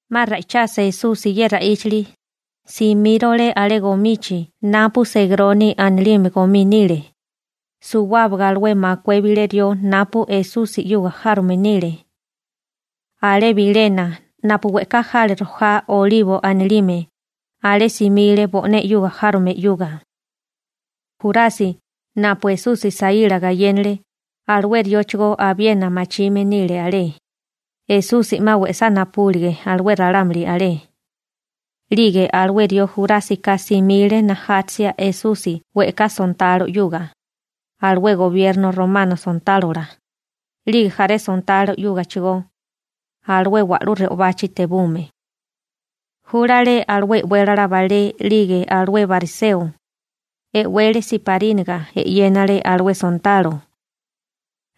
'Ma ra'ichasa Esusi ye ra'íchali, simírole alé gomichi napu Segroni anilime gomí nile, suwábaga alué makué bilé rió napu Esusi 'yuga járome nile. Alé bilena napu we'ká jale rojá olibo anilime, alé simile bo'né 'yuga járome 'yuga. Jurasi, napu Esusi saíla gayénale, alué rióchigó abiena machime nile alé, Esusi 'ma we'sá napubúlige alué ralámuli alé. 'Lige alué rió Jurásika simile najátasia Esusi we'ká sontalo 'yuga, alué gobierno romano sontálola, 'lige jaré sontalo 'yúgachigó, alué wa'lú re'obachi tebume. Júlale alué e'wélala balé 'lige alué bariseo. E'wele siparínaga 'yénele alué sontalo.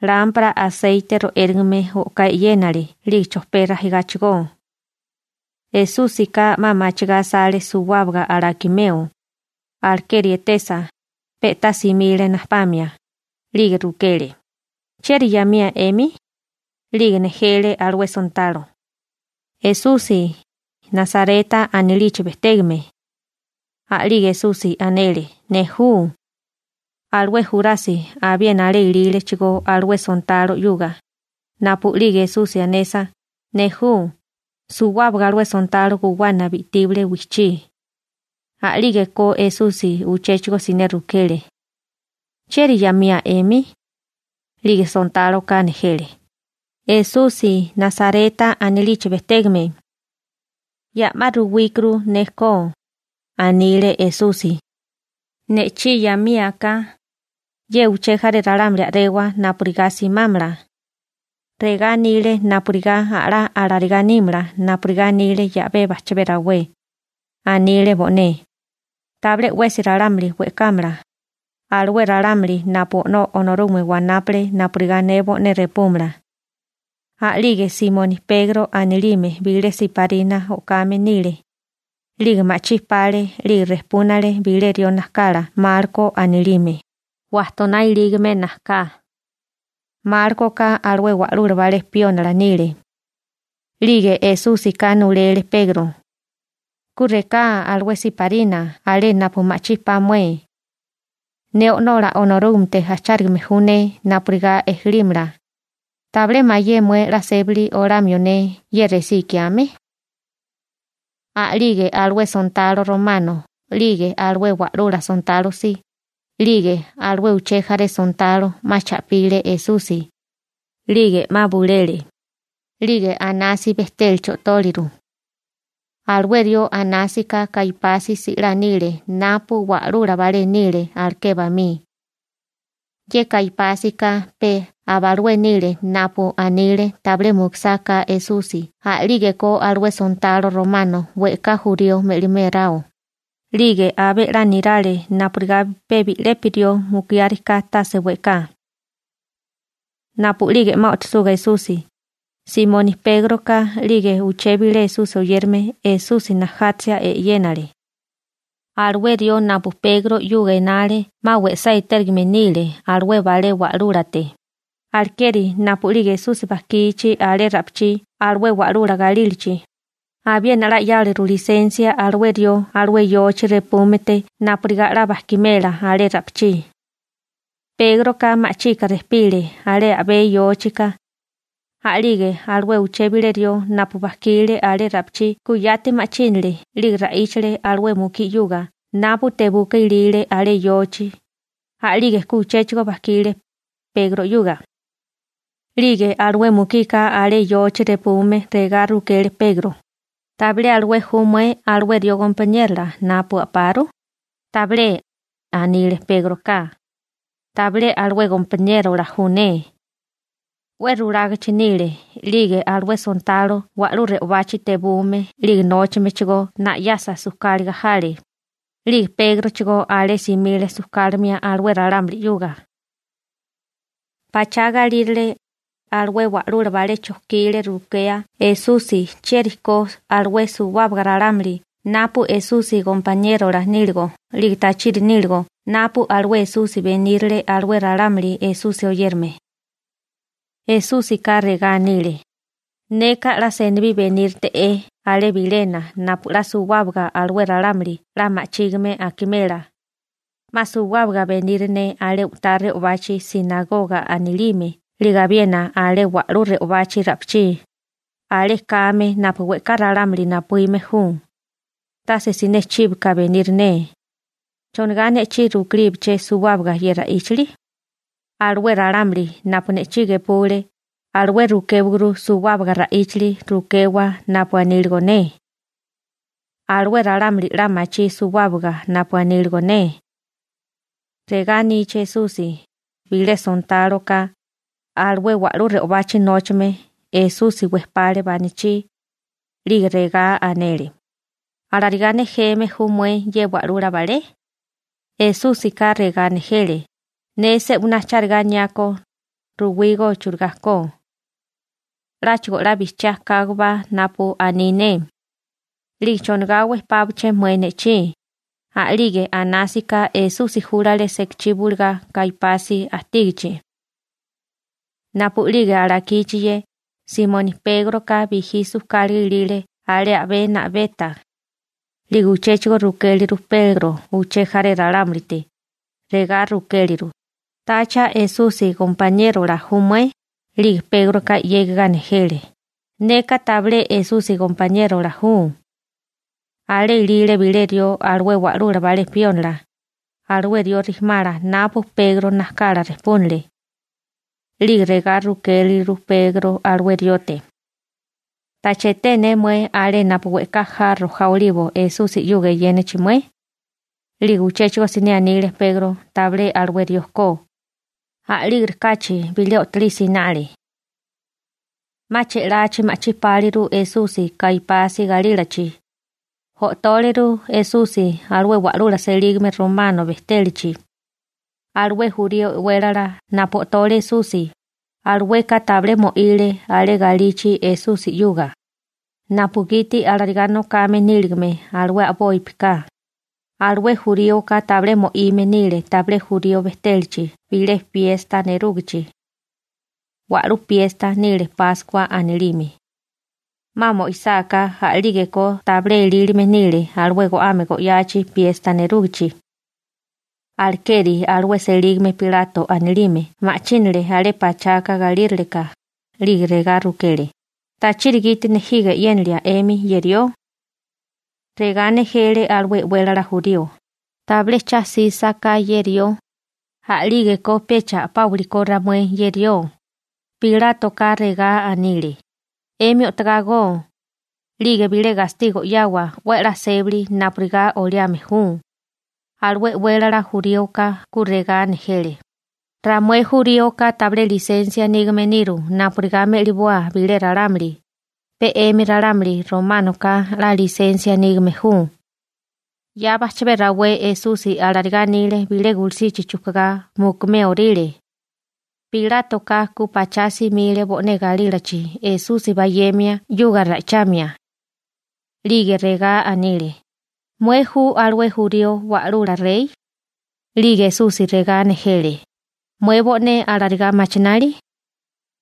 Lámpara aseite ro'érigame o'ká e'yénele 'lige chojpé rajigáchigó. Esúsika 'ma machigá asale suwábaga alakimeo, alekeri etesa, pe'tá simile najtepamia, 'lige rukele: ―¿Chieri 'yamía 'emi? 'Lige nejele alué sontalo: ―Esusi, Nasareta anilichi bejtégame. A'lige Esusi anele: ―Ne ju. Alué Jurasi abiena alé ilílechigó alué sontalo 'yuga. Napu'lige Esusi anesa, «Ne ju», suwábaga alué sontalo guwana bi'tíbale wijchí. A'lígeko Esusi uchéchigo siné rukele: ―¿Chieri 'yamía 'emi? 'Lige sontáloka nejele: ―Esusi, Nasareta anilichi bejtégame. ―Ya'má ruwíkuru ne ko ―anile Esusi―. Ne'chí 'yamía ka, ye uché jaré ralámuli a'rewa napurigá simámala. Regá anile napurigá a'lá alarigá nímala napurigá anile 'yabé bajchabé rawé. Anile bo'né: «Tabilé 'wesi ralámuli we'kámala, alué ralámuli napu O'nó Onorúgame wanápale napurigá ne bo'né repúmala.» A'lige Simoni Pegro anilime bilé siparina o'kame nile, 'lige ma'chí pale, 'lige rejpúnale bilé rió najkala Malko anilime, wajtoná ilígame najká. Málkoka alué wa'lula balé piónila nile. 'Lige Esúsika nulele Pegro: ―Ku reká alué siparina alé napu ma'chí pa mué. Ne O'nola Onorúgamete ajchárigame ju ne napurigá ejelímala. ¿Tabilé mayé mué 'la sébali olamio ne ye resí ikiame? A'lige alué sontalo romano 'lige alué wa'lula sontalo si, 'lige alué uché jaré sontalo 'ma cha'pile Esusi, 'lige 'ma bulele, 'lige Anasi bejtélachi o'tóleru. Alué rió Anásika Kaipasi si'lá nile napu wa'lula balé nile aleké bamí. Ye Kaipásika pe aba alué nile napu anile tabilé mukusáká Esusi a'lígeko alué sontalo romano we'ká jurío me'liméráo, 'lige abé 'la nirale napurigá pe bi'lepi rió mukiáriká tase we'ká. Napu'lige 'ma o'tosuga Esusi, Simoni Pégroka 'lige uché bilé Esusi oyérame Esusi najátasia e'yénale. Alué rió napu Pegro 'yuga enale 'ma we'sá etérigame nile alué balé wa'lúlate, alekeri napu'lige Esusi bajkichi alé ra'pichí alué wa'lula galílachi, abiena 'la 'yáleru lisensia alué rió alué yochi repúmete napurigá 'la bajkimela alé ra'pichí. Pégroka ma'chika rejpile alé a'bé yóchika. A'lige alué uché bilé rió napu bajkile alé ra'pichí ku yati ma'chínale 'lige ra'íchale alué mukí 'yuga napu tebuka ilile alé yochi. A'lige ku uchéchigo bajkile, Pegro 'yuga. 'Lige alué mukika alé yochi repume regá rukele Pegro: ―¿Tabilé alué ju mué alué rió gompaniérola napu a'paru? ―Tabilé ―anile Pégroka―. Tabilé alué gompaniérola ju ne. 'We rulágachi nile, 'lige alué sontalo wa'lú re'obachi tebume 'lige nóchamechigó na'yasa sujkáliga jale. 'Lige Pégrochigó alé simile sujkálimia alué ralámuli 'yuga. Pachá galírale, alué wa'lula balé chojkile rukea Esusi chieri ko alué suwábaga ralámuli napu Esusi gompaniérola níligo 'lige tachiri níligo napu alué Esusi benírile alué ralámuli Esusi oyérame. Esúsika regá anile: ―Neka 'la senibí 'la benírite'é alé bilena napu 'la suwábaga alué ralámuli 'la ma'chígime akimela. 'Ma suwábaga beniri ne alé u'tá re'obachi «sinagoga» anilime 'lige abiena alé wa'lú re'obachi ra'pichí, alé kame napu we'ká ralámuli napuíme ju, tase siné chíboka beniri ne. ¿Chonigá ne'chí rukéliaché suwábaga ye ra'íchali? Alué ralámuli napu ne'chí gepule, alué rukéwaguru suwábaga ra'íchali rukewa napu aníligo ne. Alué ralámuli 'la machí suwábaga napu aníligo ne. Regá anichi Esusi, bilé sontáloka, alué wa'lú re'obachi nóchame, Esusi wejpale banachí, 'lige regá anele: ―¿Alarigá nejeme ju mué ye wa'lula balé? Esúsika regá nejele: ―Ne se'winá charigá aniákó, ruwígó churigá ko. 'Láchigo 'la bijchiá kágobá napu aní ne. ¿'Lige chonigá wejpápaché mué ne'chí? A'lige Anásika Esusi júlale sekachí bulugá Kaipasi ajtígichi. Napu'lige alakichi ye, Simoni Pégroka bijí sujkáliga ilile alé a'bé na'beta. 'Lige uchéchigo rukéleru Pegro uché jaré ralámulite, regá rukéleru: ―¿Tacha Esusi gompaniérola ju mué? 'Lige Pégroka 'yégiga nejele: ―Neka tabilé Esusi gompaniérola ju. Alé ilile bilé rió alué wa'lula balé piónila, alué rió rijimala napu Pegro najkala rejpúnale. 'Lige regá rukéleru Pegro alué riote: ―¿Tacha eté ne mué alé napu we'ká ja rojá olibo Esusi 'yuga eyénachi mué? 'Lige uchéchigo siné anile Pegro tabilé alué rió ko. A'lígerikáchi bilé o'tolí sinale. 'Ma che'lachi ma'chí páliru Esusi Kaipasi galílachi, o'tóleru Esusi alué wa'lula selígame romano bejtélachi. Alué jurío e'wélala napu o'tole Esusi, alueka tabilé mo'ile alé galichi Esusi 'yuga, napugiti alarigá nokame níligame alué a'bopi ka, alué juríoka tabilé mo'ime nile tabilé jurío bejtélachi bilé piesta nerúgichi. Wa'lú piesta nile Páskua anilime. 'Ma mo'isáká a'lígeko tabilé elílime nile alué go'ame go'yachi piesta nerúgichi. Alekeri alué selígame Pilato anilime ma'chínale alé pachaka galíraleká, 'lige regá rukele: ―¿Tachiri gite nejiga e'yénilia 'emi ye rió? Regá nejele alué e'wélala jurío: ―Tabilé cha 'sísaká ye rió, a'lígeko pecha a'páwili ko ramué ye rió. Pilátoka regá anile: ―'Emi o'togá go, 'lige bilé gastigo 'yawa 'we a'lá sébali napurigá oliame ju. Alué e'wélala juríoka ku regá nejele: ―Ramué juríoka tabilé lisensia nígame niru napurigá me'liboa bilé ralámuli, pe 'emi ralámuli románoka 'la lisensia nígame ju. ('Ya bajchabé rawé Esusi alarigá anile bilé gulusichi chujkugá mukuméoríle.) Pilátoka ku pachá simile bo'né galílachi Esusi bayemia 'yuga ra'ichamia. 'Lige regá anile: ―¿Mué ju alué jurío wa'lula rey? 'Lige Esusi regá nejele: ―¿Mué bo'né alarigá machinali?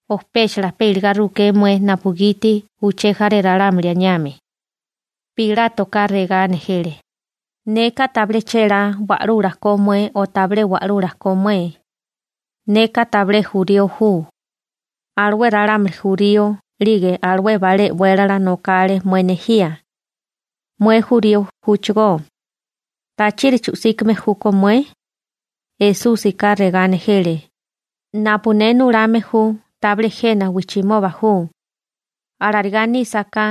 ¿O péchala pe iligá ruké mué napugiti uché jaré ralámuli aniame? Pilátoka regá nejele: ―Neka tabilé chélá wa'lula ko mué o tabilé wa'lula ko mué. Neka tabilé jurío ju. Alué ralámuli jurío 'lige alué balé e'wélala nokale mué nejía. Mué jurío júchigó. ¿Tachiri chu'síkame júkó mué? Esúsika regá nejele: ―Napu ne nulame ju, tabilé jena wijchimoba ju. Alarigá nísaká,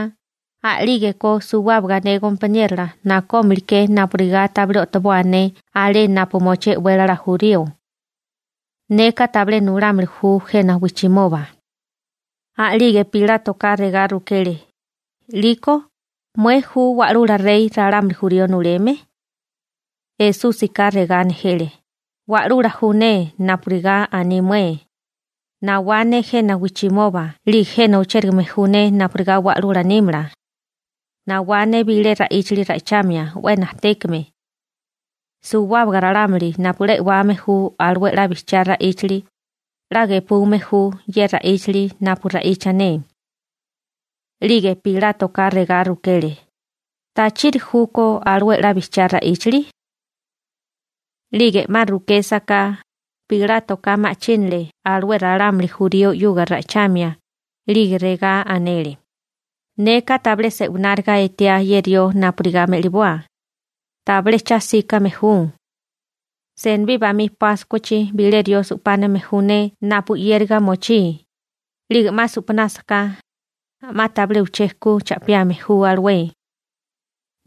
a'lígeko suwábaga ne gompaniérola nakómiliké napurigá tabilé o'toboa ne alé napu mochí e'wélala jurío. Neka tabilé nulámili ju jena wijchimoba. A'lige Pilátoka regá rukele: ―'Liko ¿mué ju wa'lula rey ralámuli jurío nuleme? Esúsika regá nejele: ―Wa'lula ju ne napurigá aní mué. Nawá ne jena wijchimoba 'lige jena ochérigame ju ne napurigá wa'lula nímala. Nawá ne bilé ra'íchali ra'ichamia 'we najtékame. Suwábaga ralámuli napu 'la e'wame ju alué 'la bijchiá ra'íchali, 'la gepume ju ye ra'íchali napu ra'icha ne. 'Lige Pilátoka regá rukele: ―¿Tachiri júkó alué 'la bijchiá ra'íchali? 'Lige 'ma rukésaká, Pilátoka ma'chínale alué ralámuli jurío 'yuga ra'ichamia, 'lige regá anele: ―Neka tabilé se'wináriga etiá ye rió napurigá me'liboa. Tabilé cha 'síkame ju. Senibí bamí Páskuachi bilé jurío su'páname ju ne napu 'yériga mochí, 'lige 'ma su'panásaká, 'ma tabilé uché ku cha'piame ju alué.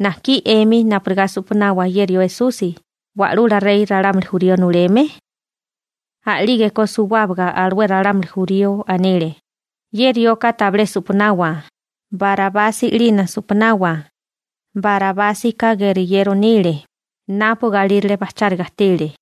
¿Najkí 'emi napurigá su'panawa ye rió Esusi, wa'lula rey ralámuli jurío nuleme? A'lígeko suwábaga alué ralámuli jurío anile: ―¡Ye rioka tabilé supanawa! ¡Barabasi 'lina su'panawa! Barabásika geriyero nile, napu galírale bajcháriga ajtile.